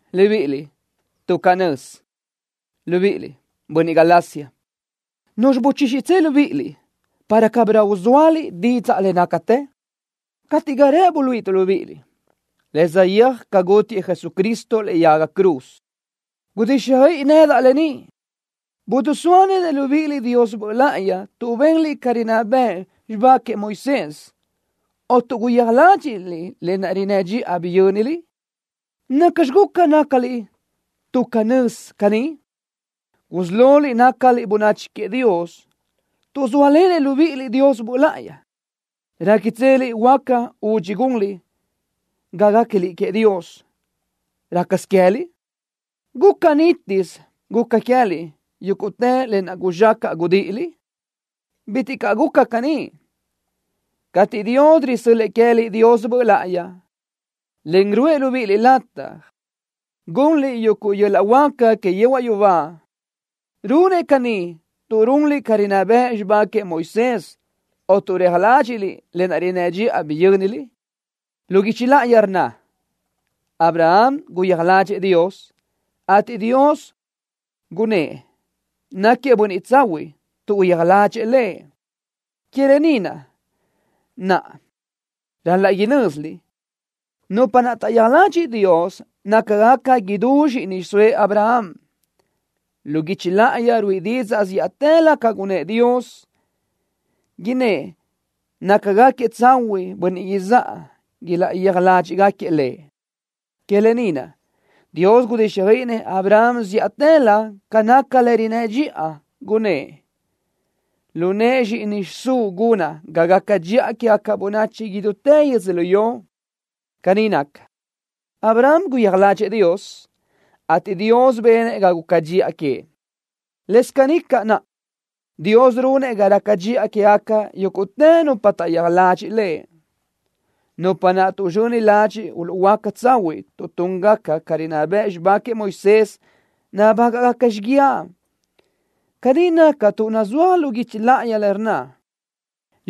Libíʼiliʼ, tuʼ canö́z, libíʼiliʼ, bönniʼ Galacia. ¿Nuzxi gulúʼutsö libíʼiliʼ nëbi para cabirö uzóaliʼ didzaʼ le nácatë? Gate ga rëʼ buluíʼituʼ libíʼiliʼ le saʼyéaj ca gútiëʼ Jesucristo lëʼe yaga cruz. Gudíxjöiʼi nedaʼ lë ni. ¿Bidisóalenëʼ libíʼiliʼ Dios Böʼ láʼayi tuʼ benliʼ ca rinná bëʼ xibá queëʼ Moisés o tuʼ guyija ládxiʼliʼ le rinnë́ dxiʼa biyö́niliʼ? ¿Nacxi guca nácaliʼ tuʼ canö́z caní? Gusí loliʼ nácaliʼ bönachi queëʼ Dios tuʼ zóalenëʼ libíʼiliʼ Dios Böʼ láʼayi. ¿Réquitseliʼ huáca udxi gunliʼ ga guéquiliʼ queëʼ Dios rácasö queë́liʼ? ¿Guca nítisö guca queë́liʼ yúguʼtë lë naʼ guzxacaʼ gudíʼiliʼ? ¡Bitiʼ caʼ guca caní! Cateʼ Dios risö́l-lëʼë queë́liʼ Dios Böʼ láʼayi, en ruʼë libíʼiliʼ lataj gunliʼ yuguʼ yöl-laʼ huáca que yehuaʼ yubá, ¿runëʼ caní tuʼ runliʼ ca rinná bëʼ xibá queëʼ Moisés o tuʼ reja ládxiʼliʼ le rinnë́ dxiʼa naʼ biyö́niliʼ? Lu guichi láʼayi rnna: Abraham guyija ládxëʼë Dios, ateʼ Dios gunnë́ʼ náquiëʼ bönniʼ tsahuiʼ tuʼ guyija ládxëʼë Lëʼ. Que lë ni na naʼ ral-laʼ inö́ziliʼ, nupa naʼ taʼyija ladxiʼ Dios nácagaca idú zxíʼini xiʼsóëʼ Abraham. Lu guichi láʼayi ruíʼi didzaʼ zíʼatëlö ca gunëʼ Dios, innë́ʼ nácagaquiëʼ tsahuiʼ bönniʼ izáʼa ilaʼyija ládxëʼë Lëʼ. Que lë ni naʼ Dios gudíxjöiʼinëʼ Abraham zíʼatëlö ca naca le rinnë́ dxiʼa, gunnë́ʼ: “Lu nëʼë Zxíʼini xiʼsúʼ gunaʼ ga gaca dxiʼa quégaca bönachi idutë yödzölió.” Caní naca, Abraham guyija ládxëʼë Dios, ateʼ Dios benëʼ ga guca dxiʼa queëʼ. Lës caní caʼ naʼa, Dios runëʼ ga raca dxiʼa quégaca yúguʼtë nupa taʼyija ladxiʼ Lëʼ. Nupa naʼ tuʼzxöni ladxiʼ uluʼhuöáca tsahuiʼ tuʼ túngaca ca rinná bëʼ xibá queëʼ Moisés, nabágaʼgaca xíguiaʼ. Caní naca tuʼ nazúaj lu guichi láʼayi, le rnna: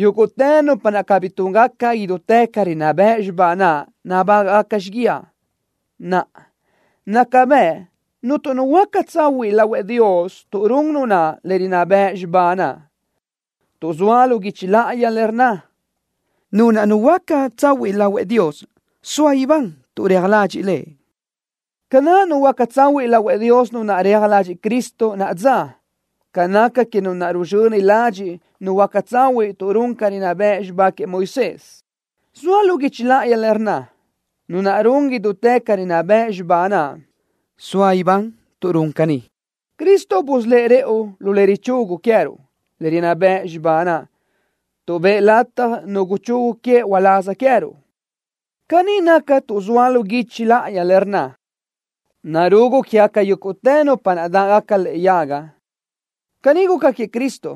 “Yúguʼtë nupa naʼ cabí túngaca idutë ca rinná bëʼ xibá naʼ nabágaʼgaca xíguiaʼ.” Naʼa, naca bëʼ cuntu nu huöáca tsahuiʼ lahuëʼ Dios tuʼ run nu naʼ le rinná bëʼ xibá naʼ, tuʼ zoa lu guichi láʼayi le rnna: “Nu naʼ nuhuöáca tsahuiʼ lahuëʼ Dios soa ibán tuʼ reja ladxiʼ Lëʼ.” Ca naʼ nuhuöáca tsahuiʼ lahuëʼ Dios nu naʼ reja ladxiʼ Cristo nadzáʼ ca naca que nu naʼ ruzxöni ladxiʼ nuhuöáca tsahuiʼ tuʼ run ca rinná bëʼ xibá queëʼ Moisés. Zoa lu guichi láʼayi le rnna: “Nu naʼ run idutë ca rinná bëʼ xibá naʼ soa ibán tuʼ run caní.” Cristo busölë́ʼ rëʼu lu le richugu queë́ruʼ le rinná bëʼ xibá naʼ tuʼ bëʼë latja nu guchugu queëʼ uláz queë́ruʼ. Caní naca tuʼ zoa lu guichi láʼayi le rnna: “Narugu quégaca yúguʼtë nupa naʼ dáʼgaca lëʼe yaga.” Caní guca queëʼ Cristo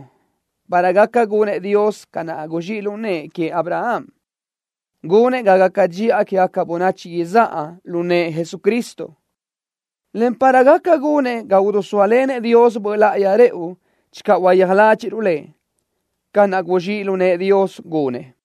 para gaca gunëʼ Dios ca naʼ guzxíʼ lu nëʼë queëʼ Abraham, gunëʼ ga gaca dxiʼa quégaca bönachi izáʼa lu nëʼë Jesucristo, en para gaca gunëʼ ga idisóalenëʼ Dios Böʼ láʼayi rëʼu channö uyija ládxiʼruʼ Lëʼ, ca naʼ guzxíʼ lu nëʼë Dios gunëʼ.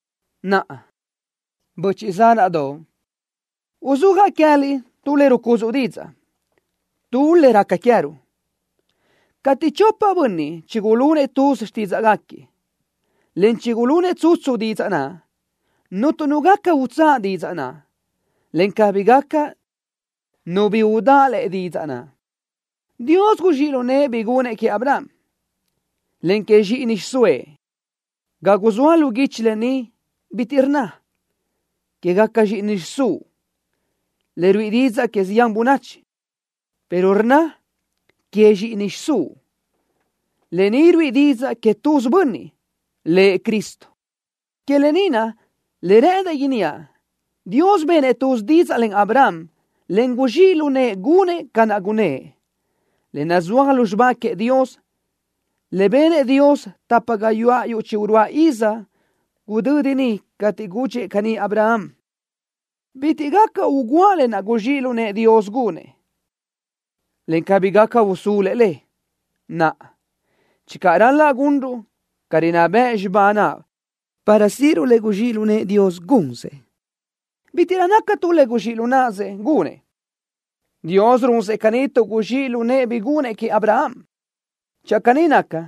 Naʼa, böchiʼ zánaʼdoʼ, uzúajaʼ queë́liʼ tu le rucudzuʼ didzaʼ, tu le raca queë́ruʼ. Cateʼ chopa bönniʼ chigulunëʼ tuz xtídzaʼgaquiëʼ, en chigulunëʼ tsutsu didzaʼ naʼ, cuntu nu gaca utsáʼ didzaʼ naʼ, en cabí gaca nu bi udáʼ lëʼe didzaʼ naʼ. Dios guzxíʼ lu nëʼë bi gunëʼ queëʼ Abraham, en que zxíʼini xiʼsóëʼ. Ga zoa lu guichi lë ni, bitiʼ rnna: “Quégaca zxíʼini xiʼsúʼ”, le ruíʼi didzaʼ que zián bönachi, pero rnna: “Que zxíʼini xiʼsúʼ.” Lë ni ruíʼi didzaʼ que tuz bönniʼ, Lëʼ Cristo. Lë ni naʼ le rë́ʼëndaʼ inníaʼ: Dios benëʼ tuz didzaʼ len Abraham, en guzxíʼ lu nëʼë gunëʼ ca naʼ gunnë́ʼ. Le nazúaj lu xibá queëʼ Dios, le benëʼ Dios tapa gayuáʼ yuʼ chi-uruáʼ iz gudödi niʼ cateʼ gudxëʼ caní Abraham, bitiʼ gaca ugúa lë naʼ guzxíʼ lu nëʼë Dios gunëʼ, en cabí gaca usulu le. Naʼa, channö ral-laʼ gunruʼ ca rinná bëʼ xibá naʼ para síʼiruʼ le guzxíʼ lu nëʼë Dios gunsëʼ, bítiʼrö naca tu le guzxíʼ lu náʼasëʼ gunëʼ. Dios runsëʼ caní tuʼ caní guzxíʼ lu nëʼë bi gunëʼ queëʼ Abraham. Channö caní naca,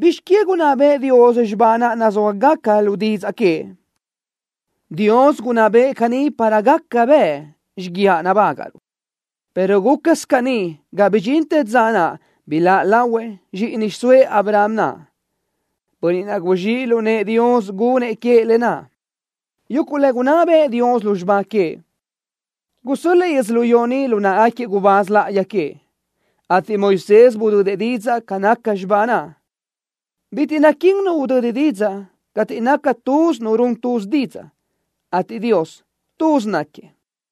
¿bizx queë gunná bëʼë Dios xibá naʼ nazúajgaca lu didzaʼ queëʼ? Dios gunná bëʼë caní para gaca bëʼ xíguiaʼ nabágaʼruʼ, pero gúcasö caní ga bidxintë dza naʼ biláʼ lahuëʼ zxíʼini xiʼsóëʼ Abraham naʼ, Bönniʼ naʼ guzxíʼ lu nëʼë Dios gunëʼ queëʼ lë naʼ. Yuguʼ le gunná bëʼë Dios lu xibá queëʼ, gusö́l-lëʼë yödzölió ni lu náʼagaquiëʼ gubáz láʼayi queëʼ, ateʼ Moisés budödëʼ didzaʼ ca nácagaca xibá naʼ. Bitiʼ naquín nu udödi didzaʼ cateʼ naca tuz nu run tuz didzaʼ, ateʼ Dios, tuz náquiëʼ.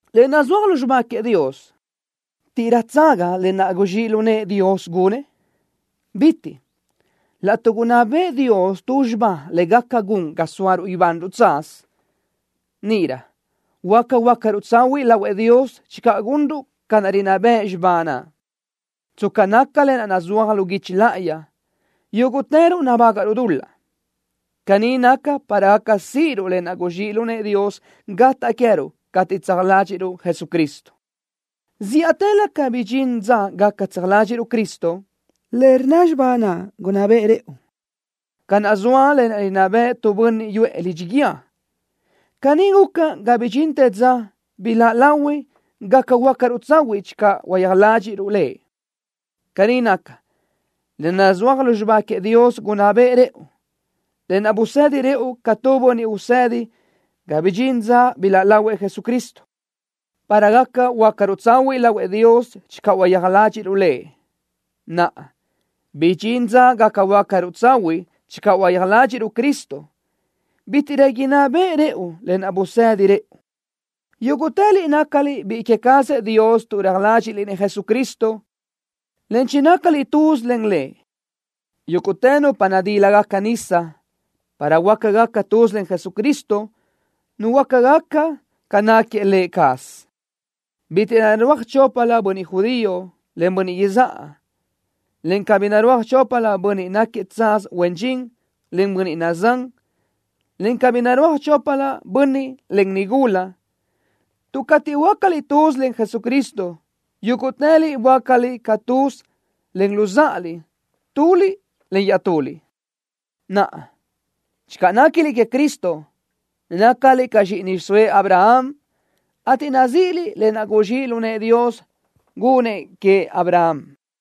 Le nazúajgaca lu xibá queëʼ Dios, ¿taʼdáʼgaca lë naʼ guzxíʼ lu nëʼë Dios gunëʼ? ¡Bitiʼ caʼ! Laʼtuʼ gunná bëʼë Dios tu xibá le gaca gun ga sóaruʼ ibanruʼ tsaz, níʼirö huáca huöácaruʼ tsahuiʼ lahuëʼ Dios channö gunruʼ ca naʼ rinná bëʼ xibá naʼ. Tsca naca lë naʼ nazúaj lu guichi láʼayi, yúguʼtëruʼ nabágaʼruʼ dul-laʼ. Caní naca para gaca síʼiruʼ lë naʼ guzxíʼ lu nëʼë Dios gataʼ queë́ruʼ cateʼ tseja ládxiʼruʼ Jesucristo. Zíʼatëlö ga bidxín dza gaca tseja ládxiʼruʼ Cristo, le rnna xibá naʼ gunná beʼe rëʼu, ca naʼ zoa le rinná beʼe tu bönniʼ yuʼë lidxi guíë. Caní guca ga bidxintë dza biláʼ lahui gaca huöácaruʼ tsahuiʼ channö uyija ládxiʼruʼ Lëʼ. Caní naca, le nazúaj lu xibá queëʼ Dios gunná beʼe rëʼu, lë naʼ busedi rëʼu ca tu bönniʼ usedi ga bidxintë dza biláʼ lahuëʼ Jesucristo, para gaca huöácaruʼ tsahuiʼ lahuëʼ Dios channö uyija ládxiʼruʼ Lëʼ. Naʼa, tuʼ bidxín dza gaca huöácaruʼ tsahuiʼ channö uyija ládxiʼruʼ Cristo, bítiʼrö inná beʼe rëʼu lë naʼ busedi rëʼu. Yúguʼtëliʼ nácaliʼ biʼi queë cazëʼ Dios tu reja ládxiʼliʼ-nëʼ Jesucristo, en chinácaliʼ tuz len Lëʼ. Yúguʼtë nupa nadílagaca nisa para huöácagaca tuz len Jesucristo, nuhuöácagaca ca náquiëʼ Lë cazëʼ. Bítiʼrö narúaj choplö bönniʼ judío, en bönniʼ izáʼa, en cabí narúaj choplö bönniʼ náquiëʼ tsaz huen dxin, en bönniʼ nazán, en cabí narúaj choplö bönniʼ, en nigula, tuʼ cateʼ böácaliʼ tuz len Jesucristo, yúguʼtëliʼ böácaliʼ caʼ tuz len luzáʼaliʼ tuliʼ iaʼtuliʼ. Naʼa, channö néquiliʼ queëʼ Cristo, nácaliʼ caʼ zxíʼini xiʼsóëʼ Abraham, ateʼ nazíʼiliʼ lë naʼ guzxíʼ lu nëʼë Dios gunnëʼ queëʼ Abraham.